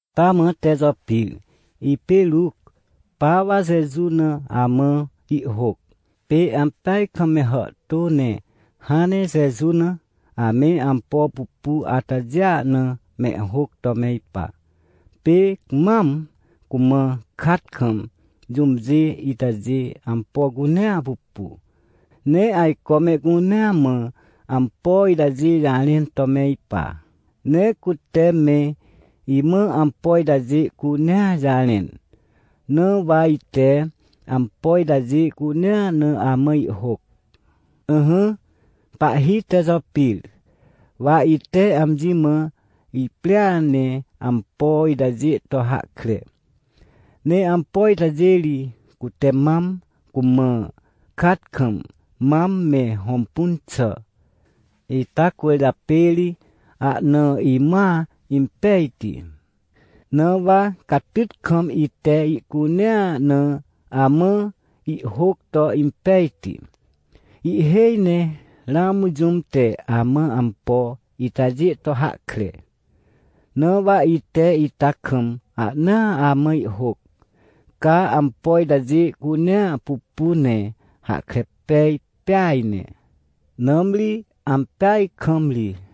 Taamã Tejopir, ipê Ruc, pa wa Jeju na amã ihhôc. Pê ampeaj kam me hàhtô ne hãn ne Jeju na, ame ampo pupu atajêa na mehhôc to me ipa. Pê mam cumã kat kam jũmjê itajê ampo cunea pupu, ne ajco mehcunea mã ampo itajê jarẽn to me ipa. Ne cute me imã ampo itajê cunea jarẽn. Na wa ite ampo itajê cunea na amã ihhôc. Ỹhỹ, pahhi Tejopir, wa ite amji mã iprĩa ne ampo itajê to hahkre. Ne ampo itajê ri, cute mam, cumã kat kam, mam me hõmpun xà. Ita cwỳrjapê ri ahna imãa impejti, na wa catyt kam ite ihcunea na amã ihhôc to impejti. Ihhêj ne ramã jũm te amã ampo itajê to hahkre. Na wa ite ita kam ahna amã ihhôc, ca ampo itajê cunea pupu ne hahkre pej pêa ne, nãmri ampeaj kam ri.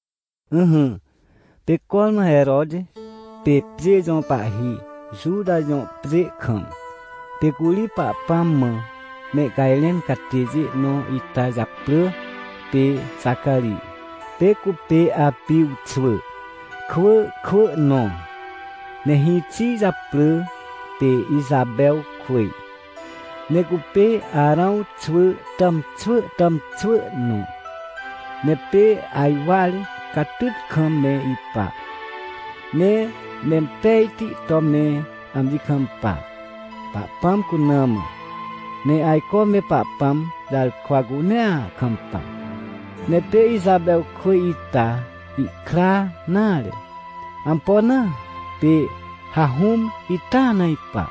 Ỹhỹ, pê cormã Heroti pê pjê jõ pahhi, Juta jõ pjê kam, pê curi Pahpãm mã mehcajrẽn catêjê nõ ita japrỳ pê Xacarij. Pê cupê Apij xwỳ kwỳ kwỳ nõ. Ne hĩxi japrỳ pê Ixapewkwỳj, ne cupê Arãw xwỳ tàmxwỳ tàmxwỳ nõ. Ne pê ajwar catyt kam me ipa, ne mempejti to me amji kampa, Pahpãm cuna mã. Ne ajco me Pahpãm jarkwa cunea kampa. Ne pê Ixapewkwỳj ita ihkra nare. Ampo na? Pê hahũm ita na ipa,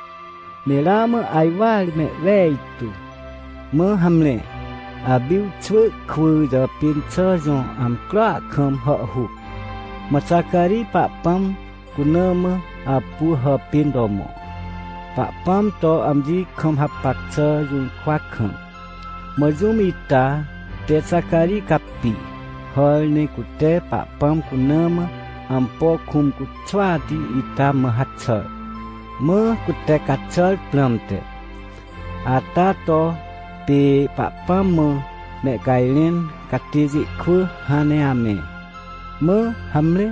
ne ramã ajwar mehwejtu. Mã hamre, Apij xwỳ kwỳ jàpên xà jõ amcroa kam hàhhuc, mã Xacarij Pahpãm cuna mã apu hàpên to mõ, Pahpãm to amji kam hapac xà jũrkwa kam. Mã jũm ita te Xacarij capi, hàr ne cute Pahpãm cuna mã ampo kũm cuxwati ita mã haxàr, mã cute caxàr prãmte. Ata to pê Pahpãm mã mehcajrẽn catêjê kwỳ hãn ne ame. Mã hamre,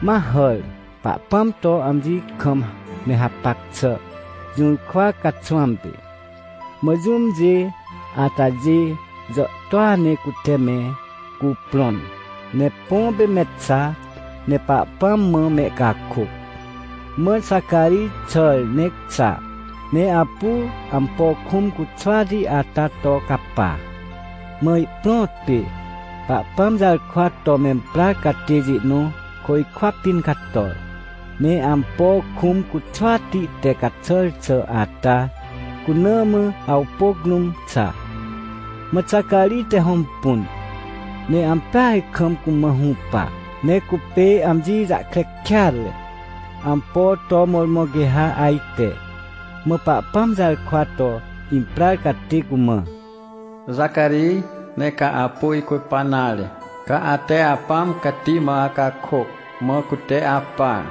ma hàr, Pahpãm to amji kam me hapac xà jũrkwa caxwãm pê. Mã jũmjê atajê jàhtôa ne cute me cuprõn, ne põ pê me xa, ne Pahpãm mã mehcakôc. Mã Xacarij xàr ne xa, ne apu ampo kũm cuxwati ata to capa. Mã ihprõt pê, Pahpãm jarkwa to memprar catêjê nõ côjkwa pĩn cator, ne ampo kũm cuxwati te caxàr xà ata cuna mã awpôc rũm xa. Mã Xacarij te hõmpun, ne ampeaj kam cumã hũpa, ne cupê amji jahkre kêatre, ampo to mõrmõ quê ha ajte. Mã Pahpãm jarkwa to imprar catê cumã: ― Xacarij, nee ca apu icupa nare, ca ate Apãm Cati mã acakôc, mã cute apar.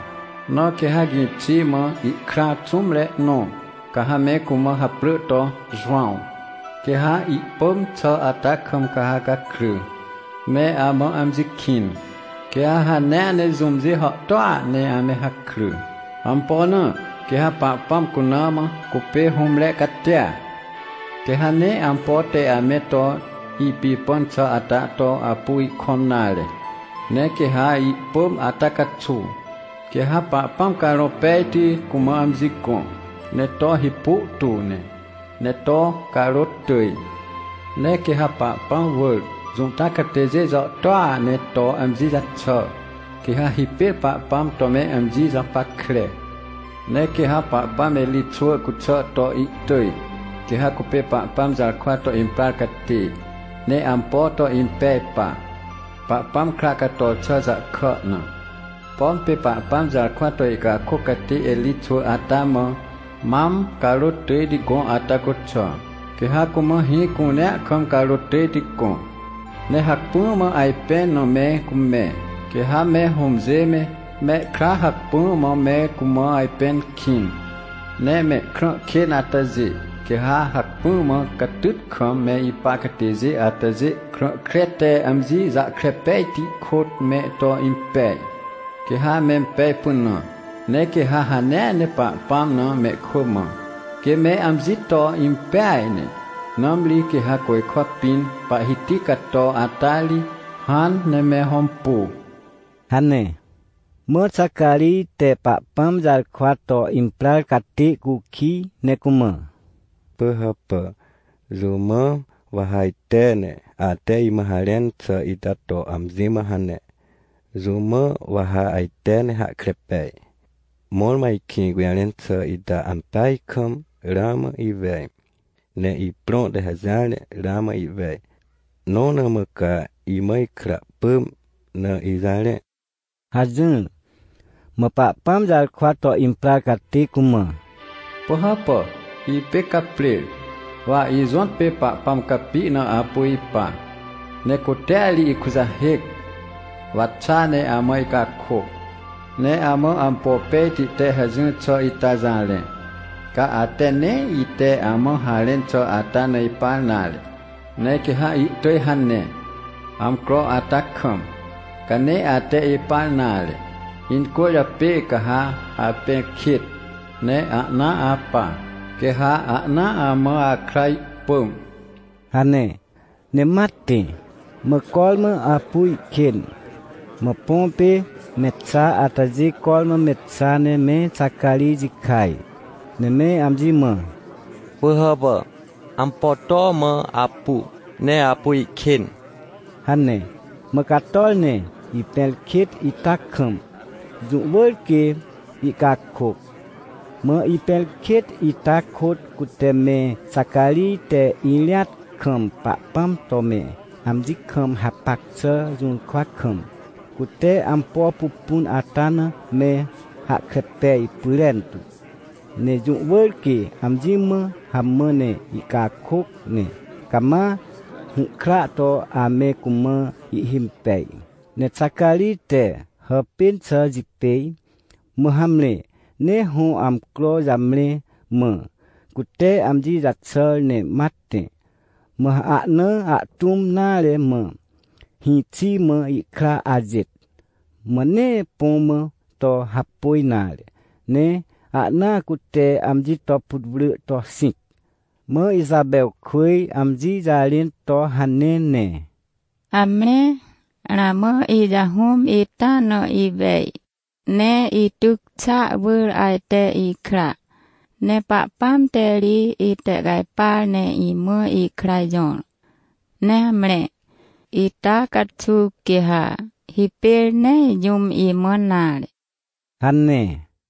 Na quê ha gĩxi mã ihkra xũmre nõ, ca ha me cumã haprỳ to Jowãw. Quê ha ihpỳm xà ata kam ca ha gakry, ne amã amji kĩn. Quê ha hanea ne jũmjê hàhtôa ne ame hakry. ― Ampo na? Quê ha Pahpãm cuna mã cupê hũmre catia. Quê ha nee ampo te ame to ipipãn xà ata to apu ihkõm nare. Ne quê ha ihpỳm ata caxuw, quê ha Pahpãm Carõ Pejti cumã amji gõ, ne to hipu tu ne, ne to carôt tỳj. Ne quê ha Pahpãm wỳr, Juta catêjê jàhtôa ne to amji jaxà, quê ha hipêr Pahpãm to me amji japackre. ― Ne quê ha Pahpãm Erij xwỳ cuxà to ihtỳj, quê ha cupê Pahpãm jarkwa to imprar catê, ne ampo to impej pa, Pahpãm kra cator xà jahkà na. Pom pê Pahpãm jarkwa to ihcakôc catê Erij xwỳ ata mã mam carôt tỳjti gõ ata cuxà, quê ha cumã hĩ cunea kam carôt tỳjti gõ. Ne hacpỹa mã ajpẽn na me cumẽ, quê ha me hũmjê me, mehkra hacpỹa mã me cumã ajpẽn kĩn. Ne mehkrã kên atajê, quê ha hacpỹa mã catyt kam me ipa catêjê atajê krã kre te amji jahkre pejti kôt me to impej, quê ha mempej pynã. Ne quê ha hanea ne Pahpãm na mehkwỳ mã, quê me amji to impeaj ne, nãmri quê ha côjkwa pĩn, Pahhiti cato ata ri, hãn ne me hõmpu ― hane. Mã Xacarij te Pahpãm jarkwa to imprar catê cukij, ne cumã: ― Pỳhàpà, jũ mã wa ha ajte, ne ate imã harẽn xà ita to amji mã hane? Jũ mã wa ha ajte ne hahkre pej, mõrmõ ajkĩ gũjarẽn xà ita ampeaj kam? Ramã iwej, ne iprõ te hajỹar ne ramã ihwej, nõ na mã ca imã ikra pỳm na ijarẽ ― hajỹr. Mã Pahpãm jarkwa to imprar catê cumã: ― Pỳhàpà, Ipê Caprer. Wa ijõtpê Pahpãm capi na apu ipa, ne cutea ri ikujahêc, wa xa ne amã icakôc, ne amã ampo pejti te hajỹr xà ita jarẽ. Ca ate nee ite amã harẽn xà ata na ipar nare, ne quê ha ihtỳj hane, amcro ata kam. Ca nee ate ipar nare, incwỳrjapê ca ha apẽrkêt, ne ahnaa apa, quê ha ahnaa amã akra ihpỳm ― hane. Ne ma tẽ. Mã cormã apu ihkên, mã põ pê me xa atajê cormã me xa ne me Xacarij jikaj, ne me amji mã: ― Pỳhàpà, ampo to mã apu, ne apu ihkên? ― hane. Mã cator, ne ipẽrkêt ita kam, jũ wỳr quê ihcakôc. Mã ipẽrkêt ita kôt cute me Xacarij te irĩat kam Pahpãm to me amji kam hapac xà jũrkwa kam, cute ampo pupun ata na me hahkre pej pyrentu, ne jũ wỳr quê amji mã hamã ne ihcakôc, ne cama hũhkra to ame cumã ihhimpej. Ne Xacarij te hàpên xà jipêj, mã hamre, ne hõ amcro jamre, mã cute amji jaxàr ne ma tẽ. Mã ahna ahtũm nare mã hĩxi mã ihkra ajêt, mã nee põ mã to hapôj nare, ne ahnaa cute amji to putwrỳ to xĩc. Mã Ixapewkwỳj amji jarẽn to: ― Hamre, ramã ijahũm ita na iwej, ne ityc xàa wỳr ajte ikra. Ne Pahpãm te ri itehcajpar ne imã ikra jõr. Ne hamre, ita caxuw, quê ha hipêr nee jũm imãn nare ― hane.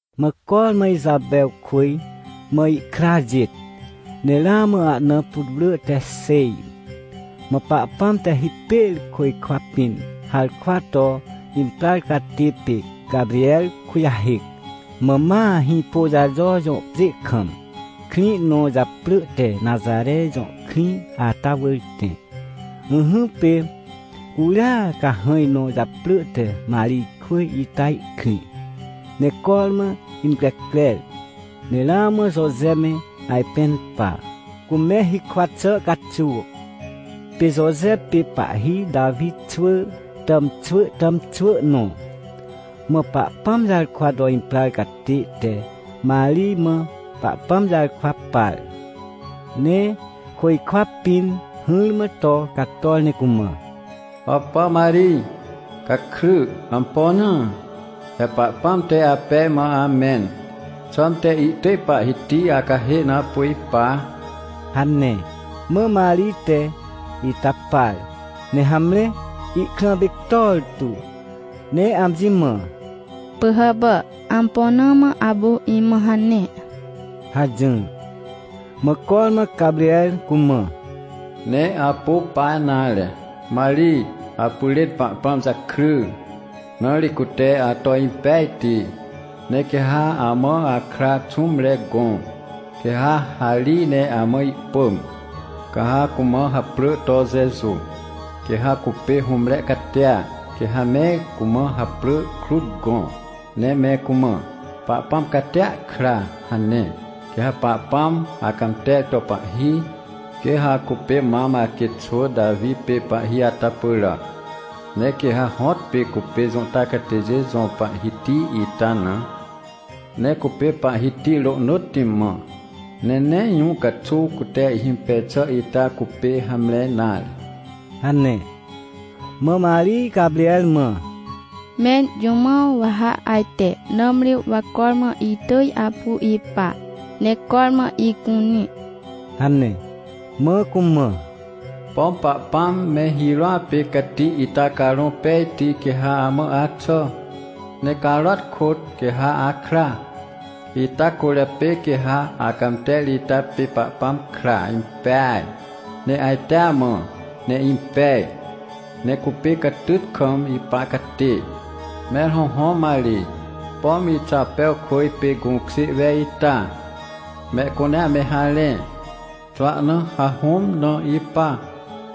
Mã cormã Ixapewkwỳj mã ihkra ajêt, ne ramã ahna putwrỳ te xêj, mã Pahpãm te hipêr côjkwa pĩn harkwa to imprar catê pê Caprer kujahêc, mã ma Hĩpôjajo jõ pjê kam, krĩ nõ japrỳ te Naxare jõ krĩ ata wỳr tẽ. Ỹhỹ, pê curia cahãj nõ japrỳ te Marijkwỳj ita ihkrĩ, ne cormã increcrer, ne ramã Joje me ajpẽn pa, cume hikwa xà caxuw. Pê Joje pê pahhi Tawi xwỳ tàmxwỳ tàmxwỳ nõ. Mã Pahpãm jarkwa to imprar catê te Marij mã Pahpãm jarkwa par. Ne côjkwa pĩn hỹrmã to cator ne cumã: ― Hàpà Marij! Gakry! Ampo na? He Pahpãm te apej mã amẽn. Xãmte ihtỳj Pahhiti acahê na apu ipa ― hane. Mã Marij te ita par, ne hamre, ihkrã pictor tu, ne amji mã: ― Pỳhàpà, ampo na mã apu imã hane? ― hajỹr. Mã cormã Caprer cumã: ― Nee apu pa nare, Marij. Apyrên Pahpãm jakry, na ri cute ato impejti. Ne quê ha amã akra xũmre gõ, quê ha harij ne amã ihpỳm, ca ha cumã haprỳ to Jeju. Quê ha cupê hũmre catia, quê ha me cumã haprỳ krut gõ, ne me cumã “Pahpãm Catia Kra” hane. Quê ha Pahpãm acãmter to pahhi, quê ha cupê mam aquêt xwỳ Tawi pê pahhi ata pyràac. Ne quê ha hõtpê cupê Juta catêjê jõ Pahhiti ita na. Ne cupê Pahhiti rohnỳtti mã, ne nee jũ caxuw cute ihhimpej xà ita cupê hamre nare ― hane. Mã Marij Caprer mã: ― Mẽr jũ mã wa ha ajte? Nãmri wa cormã itỳj apu ipa, ne cormã icunĩ ― hane. Mã cumã: ― Pom Pahpãm me hirôa pê cati ita Carõ Pejti quê ha amã axà. Ne carôat kôt, quê ha akra. Ita cwỳrjapê quê ha acãmter ita pê Pahpãm kra impeaj, ne ajtea mã, ne impej, ne cupê catyt kam ipa catê. ― Mẽr hõhõ Marij, pom Ixapewkwỳj pê gũkjê wej ita, mehcunea me harẽ, xwahna hahũm na ipa.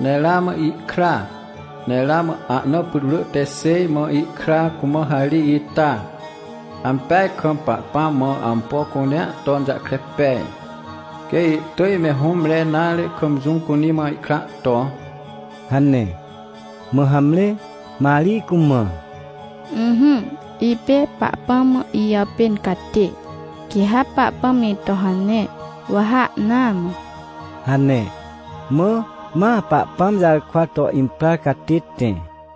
Ne ramã ihkra, ne ramã ahna putwrỳ te xêj mã ihkra cumã harij ita. Ampeaj kam Pahpãm mã ampo cunea ton jahkre pej, quê ihtỳj me hũmre nare kam jũm cunĩ mã ihkra to ― hane. Mã hamre, Marij cumã: ― Ỹhỹ, ipê Pahpãm mã ijàpên catê. Quê ha Pahpãm ito hane, wa ha ahnaa mã ― hane. Mã ma Pahpãm jarkwa to imprar catê tẽ.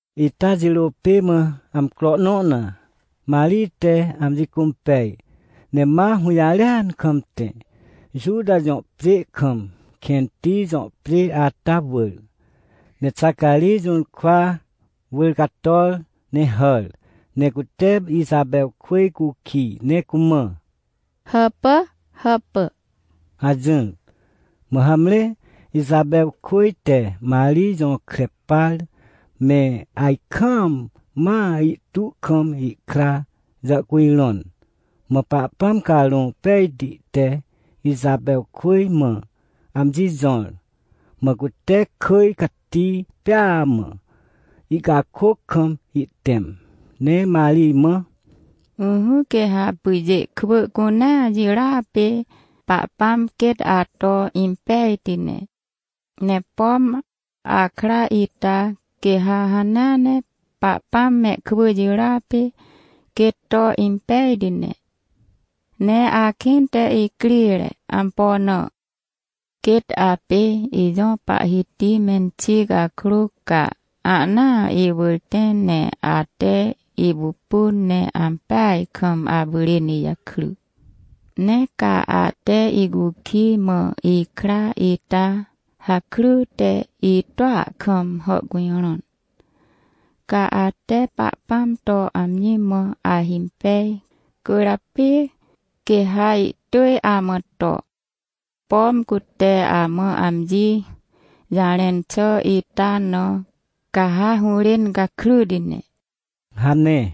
Ita jirô pê mã amcro nõ na, Marij te amji cũmpej, ne ma hũjarêan kam tẽ, Juta jõ pjê kam kẽnti jõ pjê ata wỳr. Ne Xacarij jũrkwa wỳr cator ne hàr, ne cute Ixapewkwỳj cukij ne cumã: ― Hàpà, hàpà ― hajỹr. Mã hamre, Ixapewkwỳj te Marij jõkre par me ajkaam mã ihtu kam ihkra jàhcujrõn. Mã Pahpãm Carõ Pejti te Ixapewkwỳj mã amji jõr, mã cute kỳj cati pêa mã ihcakôc kam ihtẽm. Ne Marij mã: “Ỹhỹ, quê ha pyjê kwỳ cunea jirôa pê Pahpãm quêt ato impejti ne. Ne pom akra ita, quê ha hanea ne Pahpãm mehkwỳ jirôa pê quêt to impejti ne. Ne akĩnte icrire. Ampo na? Quêt apê ijõ Pahhiti menxi cakrô, ca ahnaa iwỳr tẽ ne ate ipupun, ne ampeaj kam apyrên ijakry. Ne ca ate icukij, mã ikra ita hakryte itua kam hàhcujrõn. Ca ate Pahpãm to amji mã ahimpej, cwỳrjapê quê ha ihtỳj amã to, pom cute amã amji jarẽn xà ita na, ca ha hũrên gakryti ne” hane.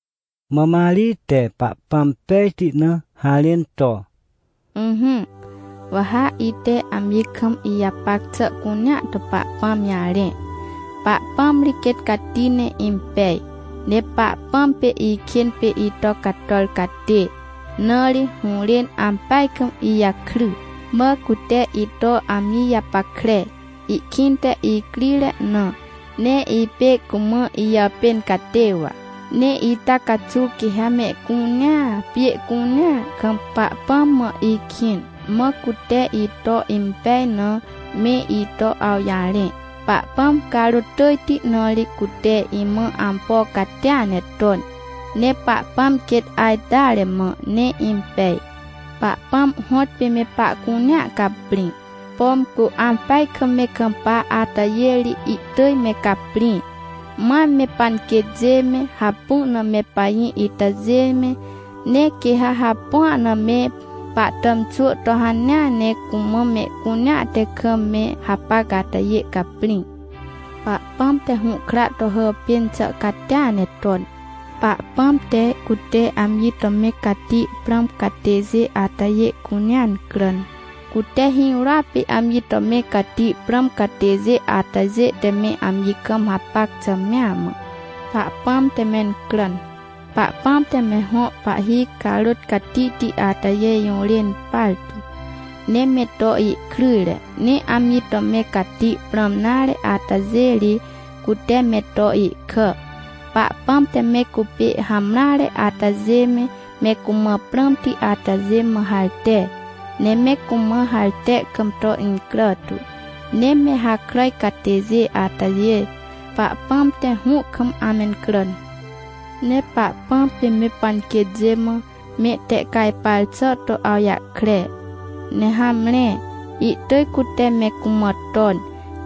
Mã Marij te Pahpãm pejti na harẽn to: “Ỹhỹ, wa ha ite amji kam ijapac xà cunea to Pahpãm jarẽ. Pahpãm ri quêt cati ne impej. Ne Pahpãm pê ikên pê ito cator catê, na ri hũrên ampeaj kam ijakry. Mã cute ito amji japackre, ihkĩnte icrire na, ne ipê cumã ijàpên catê wa. Ne ita caxuw quê ha mehcunea, pjê cunea kam, Pahpãm mã ikĩn, mã cute ito impej na, me ito awjarẽ. Pahpãm carôt tỳjti, na ri cute imã ampo catia ne ton. Ne Pahpãm quêt ajteare mã, ne impej. Pahpãm hõtpê me pahcunea caprĩ, pom cu ampeaj kam me kampa atajê ri, ihtỳj me caprĩ. Mam me panquêtjê me, hapu na me pajĩ itajê me, ne quê ha hapua na me pahtàmxwỳ to hanea ne cumã mehcunea te kam me hapac atajê caprĩ. Pahpãm te hũhkra to hàpên xà catia ne ton. Pahpãm te, cute amji to me cati prãm catêjê atajê cunea incràn. Cute hirôa pê amji to me cati prãm catêjê atajê te me amji kam hapac xà mea mã, Pahpãm te mencràn. Pahpãm te me hõ pahhi carôt catihti atajê jũrên partu, ne me to ihkryjre. Ne amji to me cati prãm nare atajê ri, cute me to ihkà. Pahpãm te me cupê hamreare atajê me, me cumã prãmti atajê mã harte, ne me cumã harte kam to incrà tu. Ne me hakràj catêjê atajê, Pahpãm te hũ kam amencràn. Ne Pahpãm pê me panquêtjê mã, mehtehcajpar xà to awjahkre. Ne hamre, ihtỳj cute me cumã ton,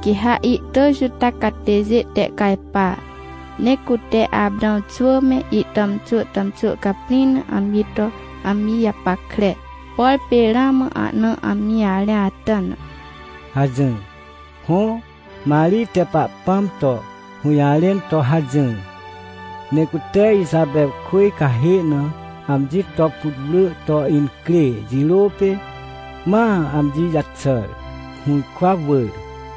quê ha ihtỳj Juta catêjê tehcajpa. Ne cute Aprãw xwỳ me, ihtàmxwỳ tàmxwỳ caprĩ na amji to amji japackre, por pê ramã ahna amji jarẽ ata na” hajỹr. Hõ, Marij te Pahpãm to hũjarẽn to hajỹr. Ne cute Ixapewkwỳj cahê na amji to putwrỳ to incrê jirô pê ma amji jaxàr, hũrkwa wỳr.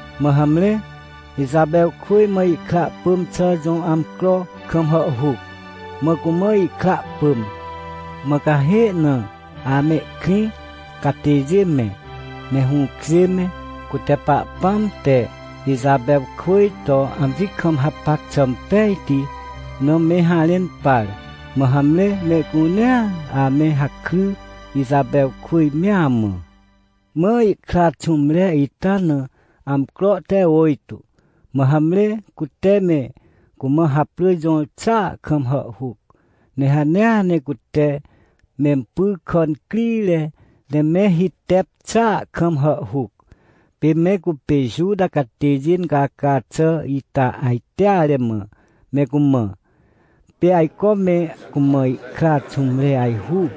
Mã hamre, Ixapewkwỳj mã ihkra pỳm xà jõ amcro kam hàhhuc, mã cumã ihkra pỳm. Mã cahê na amehkrĩ catêjê me, me hũkjê me, cute Pahpãm te Ixapewkwỳj to amji kam hapac xà impejti na me harẽn par. Mã hamre, mehcunea ame hakry, Ixapewkwỳj mea mã. Mã ihkra xũmre ita na amcro te ôjtô, mã hamre cute me cumã haprỳ jõr xàa kam hàhhuc, ne hanea ne cute mempy kà incrire ne me hitep xàa kam hàhhuc. Pê me cupê Juta catêjê incaca xà ita ajteare mã me cumã. Pê ajco me cumã ihkra xũmre ajhu,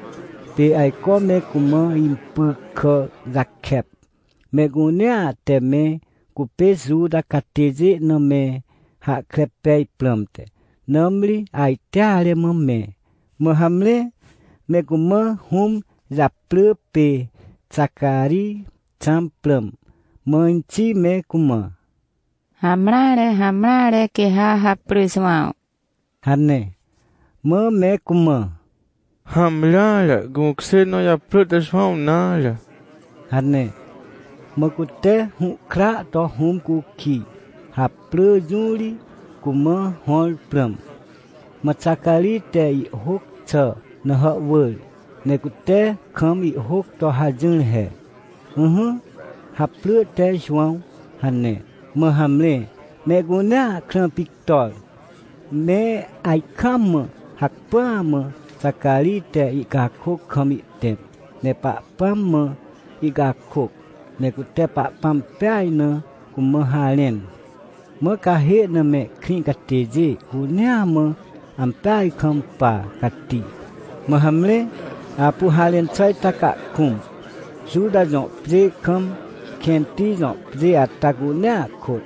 pê ajco me cumã impy kà jakep, mehcunea te me cupê Juta catêjê na me hahkre pej prãmte, nãmri ajteare mã me. Mã hamre, me cumã hũm japrỳ pê Xacarij xãm prãm. Mã inxi me cumã: ― Hamreare, hamreare, quê ha haprỳ Jowãw ― hane. Mã me cumã: ― Hamreare, gũkjê nõ japrỳ te Jowãw nare ― hane. Mã cute hũhkra to hũm cukij, haprỳ jũ ri cumã hõr prãm. Mã Xacarij te ihhôc xà na hàhwỳr, ne cute kam ihhôc to hajỹr he: “Ỹhỹ, haprỳ te Jowãw” hane. Mã hamre, mehcunea krã pictor. Me ajkaam mã hacpỹa mã Xacarij te ihcakôc kam ihtẽm, ne Pahpãm mã ihcakôc, ne cute Pahpãm peaj na cumã harẽn. Mã cahê na mehkrĩ catêjê cunea mã ampeaj kam pa cati. Mã hamre, apu harẽn xà ita cahkũm, Juta jõ pjê kam, kẽnti jõ pjê ata cunea kôt.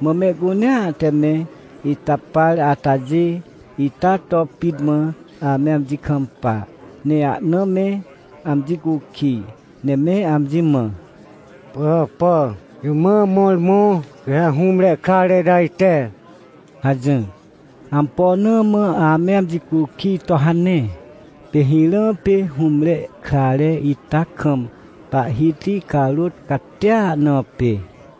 Mã mehcunea te me ita par atajê, ita to pit mã ame amji kampa, ne ahna me amji cukij, ne me amji mã: ― Pỳhàpà, jũ mã mõrmõ quê ha hũmre krare ita ajte? ― hajỹr. Ampo na mã ame amji cukij to hane? Pê hirã pê hũmre krare ita kam Pahhiti carôt catia na pê.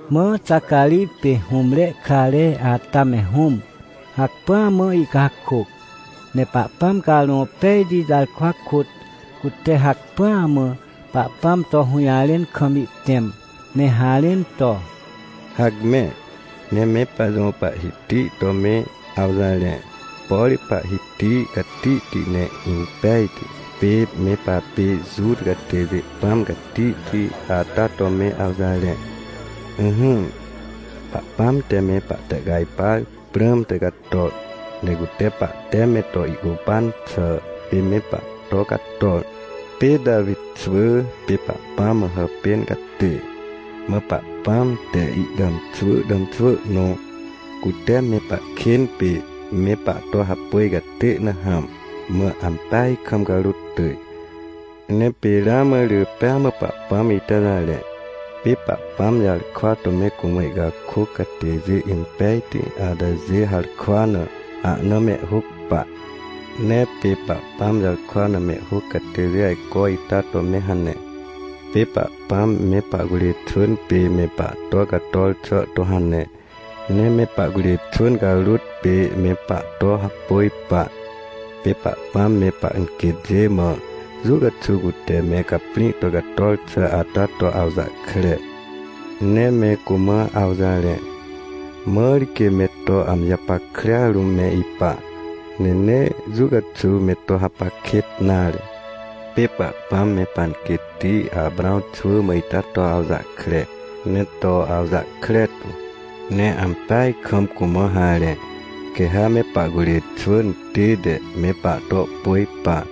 Mã Xacarij pê hũmre krare ata me hũm, hacpỹa mã ihcakôc. Ne Pahpãm Carõ Pejti jarkwa kôt cute hacpỹa mã Pahpãm to hũjarẽn kam ihtẽm, ne harẽn to: “Hacme, ne me pajõ Pahhiti to me awjarẽ, por Pahhiti catihti ne impejti pê me papê Juta catêjê Pãm Catihti ata to me awjarẽ. Ỹhỹ, Pahpãm te me pahtehcajpar prãmte cator, ne cute pahte me to ihcupan xà pê me pahto cator. Pê Tawi xwỳ pê Pahpãm mã hàpên catê, mã Pahpãm te ihtàmxwỳ tàmxwỳ nõ, cute me pahkên pê me pahto hapôj catê na hãm, mã ampeaj kam carôt tỳj. Ne pê ramã rỳ pêa mã Pahpãm ita jarẽ. Pê Pahpãm jarkwa to me cumã ihcakôc catêjê impejti atajê harkwa na ahna mehhôc pa. Ne pê Pahpãm jarkwa na mehhôc catêjê ajco ita to me hane. Pê Pahpãm me pahcurê xwỳn pê me pahto cator xà to hane, ne me pahcurê xwỳn carôt pê me pahto hapôj pa. Pê Pahpãm me panquêtjê mã jũ caxuw cute me caprĩ to cator xà ata to awjahkre. Ne me cumã awjarẽ, mãr quê me to amji japackrea rũm me ipa, ne nee jũ caxuw me to hapac kêt nare. Pê Pahpãm me panquêtti Aprãw xwỳ mã ita to awjahkre, ne to awjahkre tu. Ne ampeaj kam cumã harẽ, quê ha me pahcurê xwỳn tête me pahto pôj pa.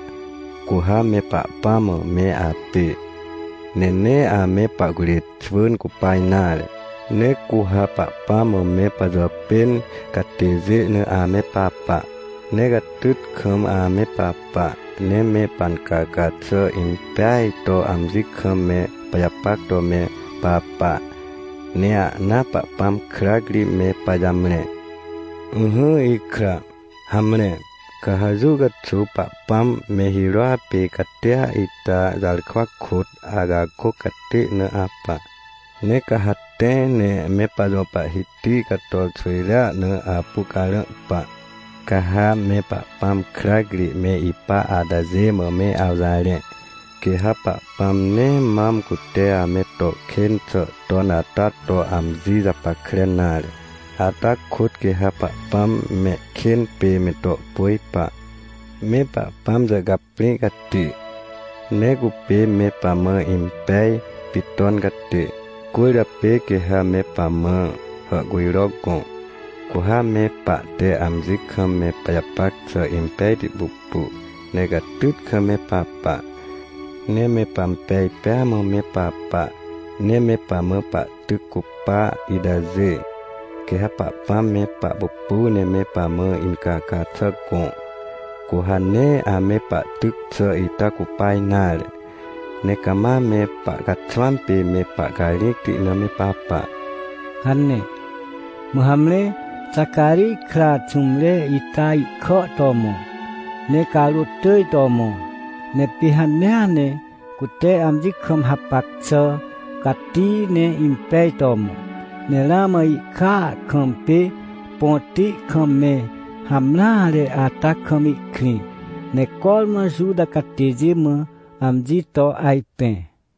Cu ha me Pahpãm mã me apê, ne nee ame pahcurê xwỳn cupa nare. Ne cu ha Pahpãm mã me pajàpên catêjê na ame papa. Ne catyt kam ame papa, ne me pancaca xà impeaj to amji kam me pajapac to me papa, ne ahnaa Pahpãm krac ri me pajamre. Ỹhỹ ikra, hamre, ca ha jũ caxuw Pahpãm me hirôa pê catia ita jarkwa kôt acakôc catê na apa, ne ca ha tẽ ne me pajõ Pahhiti cator xwỳjrea na apu carã pa. Ca ha me Pahpãm krac ri me ipa atajê mã me awjarẽ, quê ha Pahpãm nee mam cute ame to kên xà ton ata to amji japackre nare, ata kôt quê ha Pahpãm mehkên pê me to pôj pa. Me Pahpãm jàhcaprĩ cati, ne cupê me pamã impej pit ton catê, cwỳrjapê quê ha me pamã hàhcujro gõ. Cu ha me pahte amji kam me pajapac xà impejti pupu, ne catyt kam me papa, ne me pampej pêa mã me papa. Ne me pamã pahtyc cupa itajê, quê ha Pahpãm me pahpupu ne me pamã incaca xà gõ, cu ha nee ame pahtyc xà ita cupa nare, ne cama me pahcaxwãm pê me pahcarĩcti na me papa” hane. Mã hamre, Xacarij kra xũmre ita ihkà to mõ, ne carôt tỳj to mõ. Ne pê hanea ne cute amji kam hapac xà cati ne impej to mõ. Ne ramã ihkàa kam pê põti kam me hamreare ata kam ihkrĩ. Ne cormã Juta catêjê mã amji to ajpẽ.